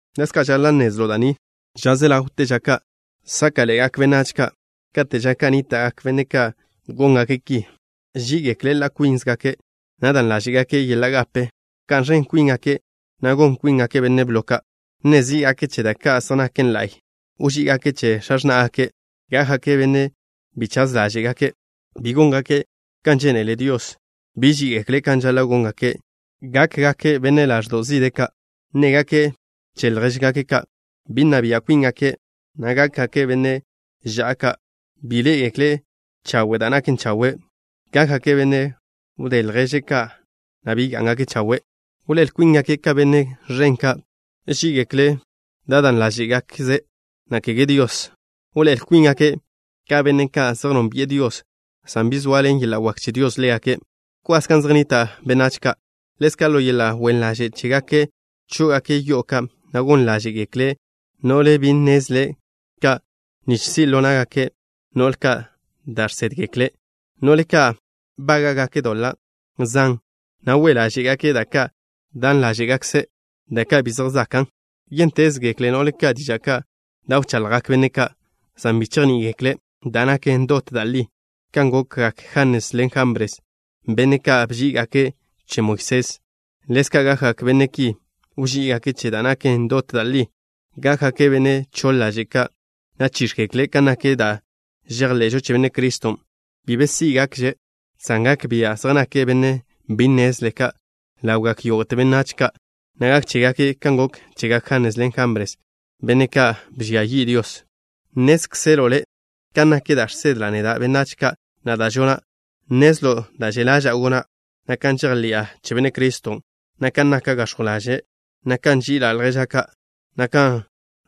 Ḻezka' žaḻa' nnezlo' da' ni: ža se ḻawte ža ka' sáka'ḻe'egak benách ka'. Kate' ža ka' nníta'gak benne' ka' góngake' ki: Ží'igekle' ḻa' kwíngakze', na' dan ḻáže'gake' yeḻa' gape. Wká'n ẕen kwíngake', na' gon kwíngake' benne' blo ka'. Nne zí'gake' che da' ka' zej naken la'y. Wží'igake' che x̱a x̱ná'gake'. Gákgake' benne' bi chaz ḻaže' ka'. Bi góngake' kan žénele Dios. Bi ží'igekle' kan žaḻa' góngake'. Gákgake' benne' zižje ḻaže' ka'. Nnégake' che ljéžgake' ka'. Bi nna bia' kwíngake', na' gákgake' benne' ža'a ka'. Bi ḻé'egekle' chawe' da' naken chawe'. Gákgake' benne' wdé ljéžgake' ka', na' bi gá'ngake' chawe'. Wḻoé'el kwíngake' ka benne' ẕen ka'. Ží'igekle' da' dan ḻáže'gakze', na' kege Dios. Wḻoé'el kwíngake' ka benne' ka' zej nónbi'e Dios, san bi soaḻen yeḻa' wak che Dios ḻégake'. Bkwas gan zej nnita' benách ka'. Ḻezka', ḻo yeḻa' wen ḻaže' chégake' chó'ogake' yo'o ka', na' gon ḻáže'gekle' no'le bi nnezle ka' nich si' ḻo na'gak no'le ka' da' žsédgekle'. No'le ka' bága'gake' doḻa' zan, na' we' ḻáže'gake' da' ka' dan ḻáže'gakze', da' ka' bi zej zakan'. Yéntezgekle no'le ka' diža' ka' da' wchaḻjgak benne' ka', san bi chejní'igekle' da' naken dot da' li. Kan gokgak Janes ḻen Jambres, benne' ka' bží'igake' che Moisés, ḻezka' gakgak benne' ki, wží'igake' che da' naken dot da' li. Gákgake' benne' choḻ ḻaže' ka', na' chíx̱gekle' kan nak da' žejḻe'žo che Benne' Criston'. Bi be sí'gakže', san gak bia' zej nake' benne' bi nnezle ka' ḻawgak yógo'te benách ka', na' gak chégake' kan gok chegak Janes ḻen Jambres, benne' ka' bžia yi' Dios. Nnézkzelo' le' kan nak da' žsedla' neda' benách ka', na' da' žona'. Nnezlo' da' že' ḻaža'a gona', na' kan žejḻi'a che Benne' Criston', na' kan naka' gax̱jw ḻaže', na' kan nži'ila' lježa' ka', na' kan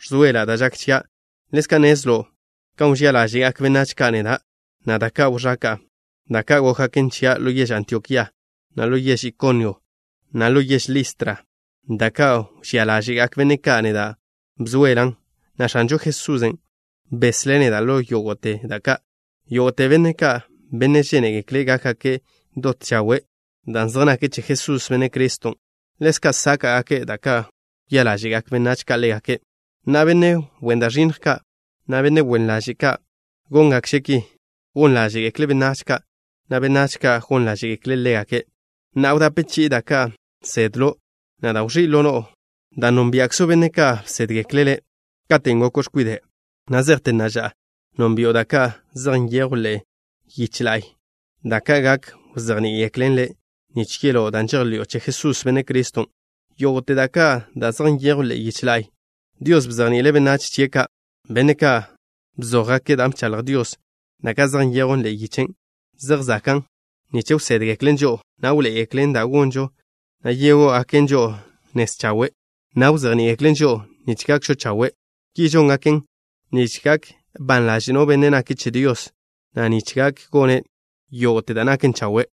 ẕzoela' da' žak chia'. Ḻezka' nnezlo' kan wžía ḻáže'gak benách ka' neda', na' da' ka' wẕaka'a, da' ka' gókgaken chia' ḻo yež Antiokía, na' ḻo yež Ikonio, na' ḻo yež Listra. Da' ka' wžía ḻáže'gak benne' ka' neda' bzoelan', na' X̱anžo Jesusen' beslé' neda' ḻo yógo'te da' ka'. Yógo'te benne' ka', benne' žénegekle' gákgake' dot chawe' dan' zej nake' che Jesús, Benne' Criston', ḻezka' sáka'gake' da' ka' kwia ḻáže'gak benách ka' ḻégake'. Na'a, benne' wen da' ẕinnj ka', na' benne' wen ḻaže' ka', góngakže' ki. Gon ḻáže'gekle' benách ka', na' benách ka' gon ḻáže'gekle' ḻégake'. Na'a, wdape chi'i da' ka' nsedlo', na' da' wẕí' ḻo no'o, dan' nónbia'kzo' benne' ka' bsédgekle' le'. Katen' goko' x̱kwide', na' zejte na'a ža, nónbi'o da' ka' zej nyejwn ḻe'e yiche la'y, da' ka' gak wzejní'igeklen le' nich yeló' dan' žejḻi'o che Jesús, Benne' Criston'. Yógo'te da' ka' zej nyejwn ḻe'e yiche la'y Dios bzejni'ile' benách chie' ka', benne' ka' bzójgake' da' bchaḻj Dios. Da' ka' zej nyejwn ḻe'e yiche zej zakan' nich wsédgeklen žo'o, na' wḻoé'egeklen da' gonžo, na' yegó'ogaken žo'o nez chawe', na' wzejní'igeklen žo'o nich gakžo chawe'. Ki žóngaken, nich gak ban ḻaže' no benne' nake' che Dios, na' nich gak gone' yógo'te da' naken chawe'.